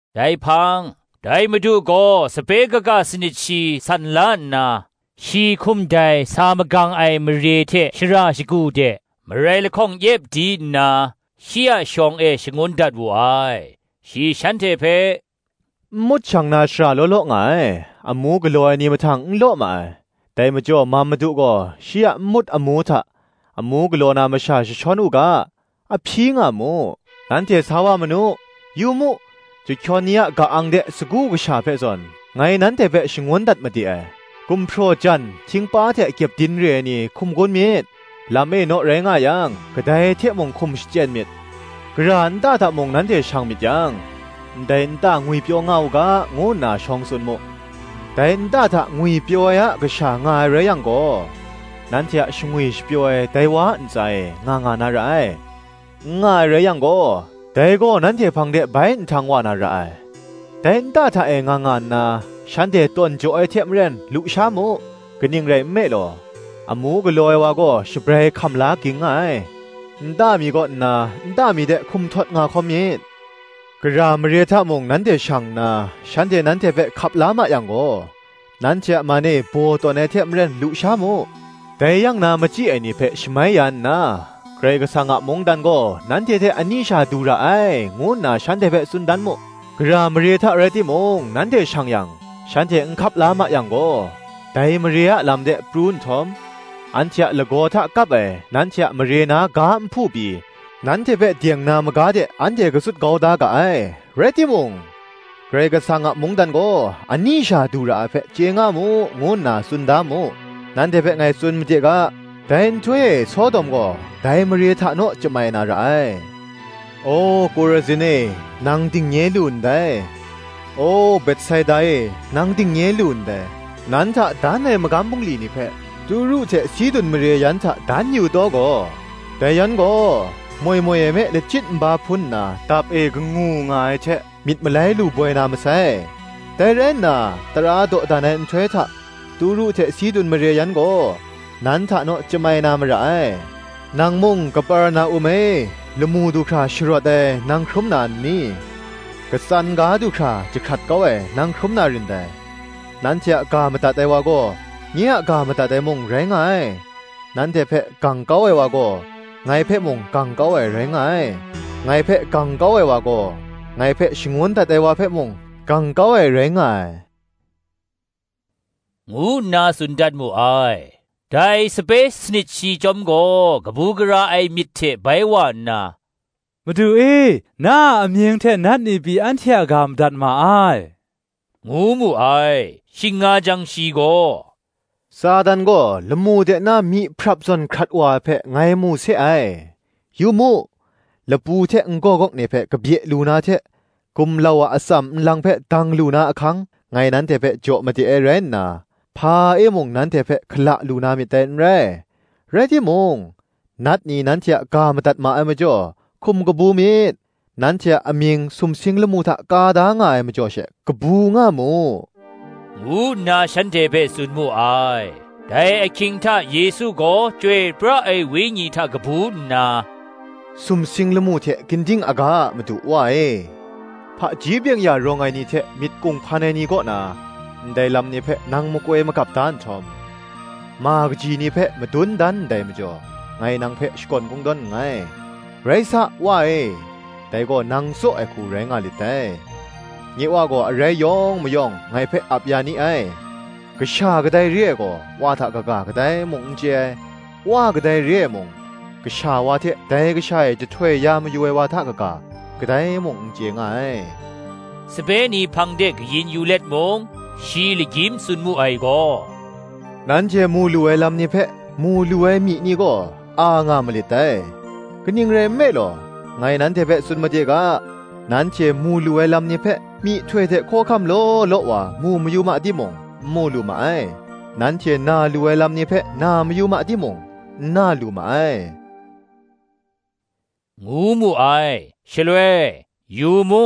Dai hpang, dai Madu gaw sape kaga sanit shi san la nna, shi hkum dai sa magang ai mare hte shara shagu de, marai lahkawng yep di nna, shi a shawng e shangun dat wu ai. Shi shanhte hpe, “Nmut shang na shara law law nga ai; amu galaw ai ni mahtang n law ma ai: dai majaw mam Madu gaw shi a nmut amu hta, amu galaw na masha jashawn u ga, a hpyi nga mu. Nanhte sa wa manu; yu mu, chyahkyawn ni a ka-ang de sagu kasha hpe zawn, ngai nanhte hpe shangun dat made ai. Gumhpraw jan, htingpa hte kyepdin re ai ni hkum gun myit; lam e naw rai nga yang, kadai hte mung hkum shachyen myit. Gara nta hta mung nanhte shang myit yang, Ndai nta ngwipyaw nga u ga, ngu nna shawng tsun mu. Dai nta hta ngwipyaw ai a kasha nga ai rai yang gaw, nanhte a shangwi shapyaw ai dai wa a ntsa e nga nga na ra ai: n nga ai rai yang gaw, dai gaw nanhte hpang de bai nhtang wa na ra ai. Dai nta hta e nga nga nna, shanhte tawn jaw ai hte maren lu sha mu: kaning rai nme law, amu galaw ai wa gaw shabrai hkam la ging nga ai: nta mi kaw nna nta mi de hkum htawt nga hkawm myit. Gara mare hta mung nanhte shang nna, shanhte nanhte hpe hkap la ma yang gaw, nanhte a man e baw tawn ai hte maren lu sha mu: dai yang na machyi ai ni hpe shamai ya nna, Karai Kasang a mungdan gaw nanhte hte ani sha du ra ai, ngu nna shanhte hpe tsun dan mu. Gara mare hta rai timung nanhte shang yang, shanhte n hkap la ma yang gaw, dai mare a lam de pru nhtawm, Anhte a lagaw hta kap ai nanhte a mare na ga nhpu pyi, nanhte hpe deng na maga de anhte katsut kau da ga ai: rai timung, Karai Kasang a mungdan gaw ani sha du ra ai hpe, chye nga mu, ngu nna tsun da mu. Nanhte hpe ngai tsun made ga, dai nhtoi e Sodom gaw dai mare hta naw chyamai na ra ai. O, Kurazin e, nang dingnye lu ndai! O, Betsaida e, nang dingnye lu ndai! nan hta dan ai magam bungli ni hpe Turu hte Sidun mare yan hta dan yu taw gaw, dai yan gaw moi moi e me lachyit nba hpun nna dap e kangu nga ai hte, myit malai lu boi na masai. Dai rai nna, tara dawdan ai nhtoi hta Turu hte Sidun mare yan gaw nan hta naw chyamai na mara ai. Nang mung, Kaperna-um e, lamu du hkra sharawt ai, nang hkrum na n ni? katsan ga du hkra jahkrat kau ai nang hkrum na rin dai. Nanhte a ga madat ai wa gaw, nye a ga madat ai mung, rai nga ai. nanhte hpe gang kau ai wa gaw, ngai hpe mung gang kau ai, rai nga ai: ngai hpe gang kau ai wa gaw, ngai hpe shangun dat ai wa hpe mung, gang kau ai rai nga ai,” ngu nna tsun dat mu ai. Dai sape sanit shi chyawm gaw kabu gara ai myit hte bai wa nna, “Madu e, na a amying hte nat ni pyi anhte a ga madat ma ai,” ngu mu ai. Shing nga jang shi gaw, “Satan gaw lamu de nna myihprap zawn hkrat wa ai hpe, ngai mu se ai. Yu mu, lapu hte n-gawgawk ni hpe kabye lu na hte, gumlau a atsam nlang hpe dang lu na ahkang, ngai nanhte hpe jaw made ai rai nna, hpa e mung nanhte hpe hkala lu na myit dai n rai. Rai timung, nat ni nanhte a ga madat ma ai majaw, hkum kabu myit; nanhte a amying sumsing lamu hta ka da nga ai majaw she, kabu nga mu,” ngu nna shanhte hpe tsun mu ai. Dai ahkying hta Yesu gaw Chyoi pra ai Wenyi hta kabu nna, Sumsing lamu hte ginding aga a Madu, Wa e: hpaji byeng-ya rawng ai ni hte myit kunghpan ai ni kaw na, ndai lam ni hpe nang makoi magap da nhtawm, ma kaji ni hpe madun dan ndai majaw, ngai nang hpe shakawn kungdawn nngai: rai sa, Wa e, dai gaw nang tsaw ai hku rai nga lit dai. Nye wa gaw arai yawng mayawng ngai hpe ap ya ni ai: Kasha kadai re ai gaw, Wa hta kaga kadai mung n chye ai; Wa kadai re ai mung, Kasha wa hte dai Kasha e jahtoi ya mayu ai wa hta kaga, kadai mung n chye nga ai. Sape ni hpang de kayin yu let mung, shi lagyim tsun mu ai gaw Nanhte mu lu ai lam ni hpe, mu lu ai myi ni gaw, a nga malit dai. Kaning rai nme law, ngai nanhte hpe tsun made ga, nanhte mu lu ai lam ni hpe myihtoi hte hkawhkam law law wa mu mayu ma timung, n mu lu ma ai; nanhte na lu ai lam ni hpe na mayu ma timung, n na lu ma ai, ngu mu ai. Shaloi, yu mu,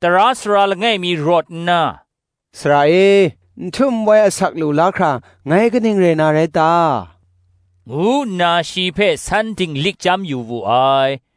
tara sara langai mi rawt nna, “Sara e, n htum n wai asak lu la hkra ngai kaning rai na rai ta?” ngu nna shi hpe san dinglik chyam yu wu ai.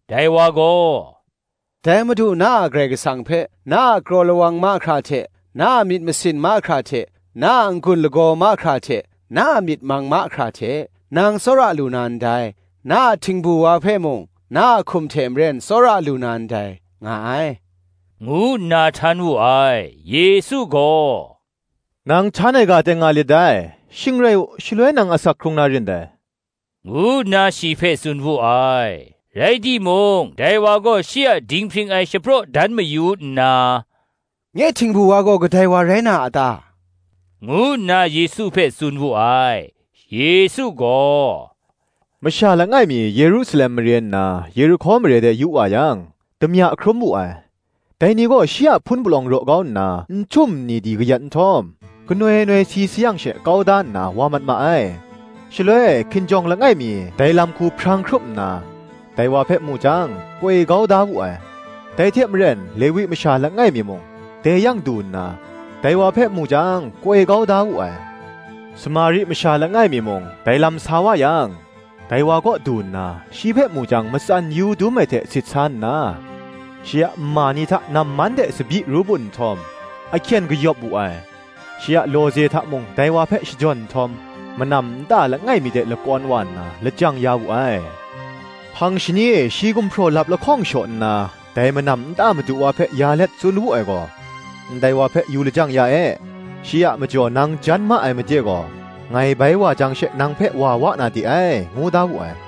Dai wa gaw, “Dai Madu, na a Karai Kasang hpe, na a kraw lawang mahkra hte, na a myit masin mahkra hte, na a n-gun lagaw mahkra hte, na a myit mang mahkra hte, nang tsawra lu na ndai; na a htingbu wa hpe mung na a hkum hte maren tsawra lu na ndai, nga ai,” ngu nna htan wu ai. Yesu gaw, “Nang htan ai ga teng nga lit dai; shing rai u, shaloi nang asak hkrung na rin dai,” ngu nna shi hpe tsun wu ai. Rai timung dai wa gaw shi a dinghpring ai shapraw dan mayu nna, “Nye htingbu wa gaw kadai wa rai na a ta?” ngu nna Yesu hpe tsun wu ai. Yesu gaw, “Masha langai mi Yerusalem mare nna Yerihko mare de yu wa yang, damya hkrum wu ai: dai ni gaw shi a hpun palawng raw kau nna, nhtum nni di kayat nhtawm, ganoi noi si sayang she, kau da nna wa mat ma ai. Shaloi hkinjawng langai mi dai lam hku hprang hkrup nna, dai wa hpe mu jang, koi kau da wu ai. Dai hte maren Lewi masha langai mi mung, dai yang du nna, dai wa hpe mu jang, koi kau da wu ai. Samari masha langai mi mung dai lam sa wa yang, dai wa kaw du nna, shi hpe mu jang, matsan yu dum ai hte sit sa nna, shi a nma ni hta namman hte tsabyi ru bun nhtawm, ahkyen kayawp wu ai: shi a lawze hta mung dai wa hpe shajawn nhtawm, manam nta langai mi de lakawn wa nna, lajang ya wu ai. Hpang shani e shi gumhpraw lap lahkawng shaw nna, dai manam nta madu wa hpe ya let tsun wu ai gaw, “Ndai wa hpe yu lajang ya e; shi a majaw nang jan ma ai made gaw, ngai bai wa jang she, nang hpe wa wa na de ai,” ngu da wu ai.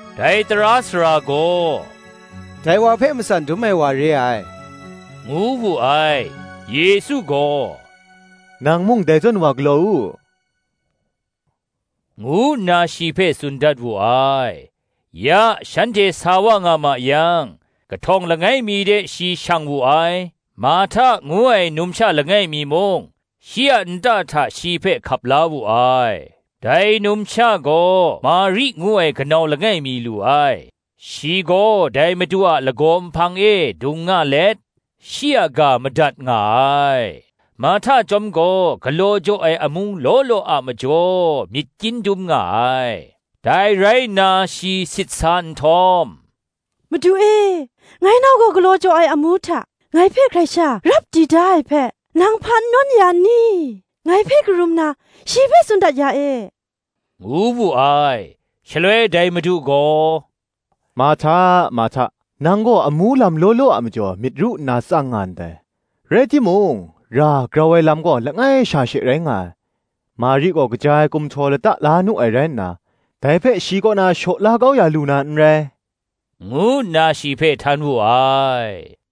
Dai tara sara gaw, Dai wa hpe matsan dum ai wa re ai, ngu wu ai. Yesu gaw, Nang mung dai zawn wa galaw u,” ngu nna shi hpe tsun dat wu ai. Ya shanhte sa wa nga ma yang, kahtawng langai mi de shi shang wu ai: Marhta ngu ai numsha langai mi mung, shi a nta hta shi hpe hkap la wu ai. Dai numsha gaw Mari ngu ai kanau langai mi lu ai: shi gaw dai Madu a lagaw nhpang e dung nga let, shi a ga madat nga ai. Marhta chyawm gaw galaw jaw ai amu law law a majaw myit kyin dum nga ai: dai rai nna shi sit sa nhtawm, “Madu e, ngai nau gaw galaw jaw ai amu hta ngai hpe hkrai sha rap di da ai hpe, nang hpa n nawn ya n ni? ngai hpe karum na, shi hpe tsun dat ya e,” ngu wu ai. Shaloi dai Madu gaw, “Marhta, Marhta, nang gaw amu lam law law a majaw myit ru nna tsang nga ndai: rai timung, ra grau ai lam gaw langai sha she rai nga ai: Mari gaw kaja ai kumhtaw lata la nu ai rai nna, dai hpe shi kaw na shaw la kau ya lu na n rai,” ngu nna shi hpe htan wu ai.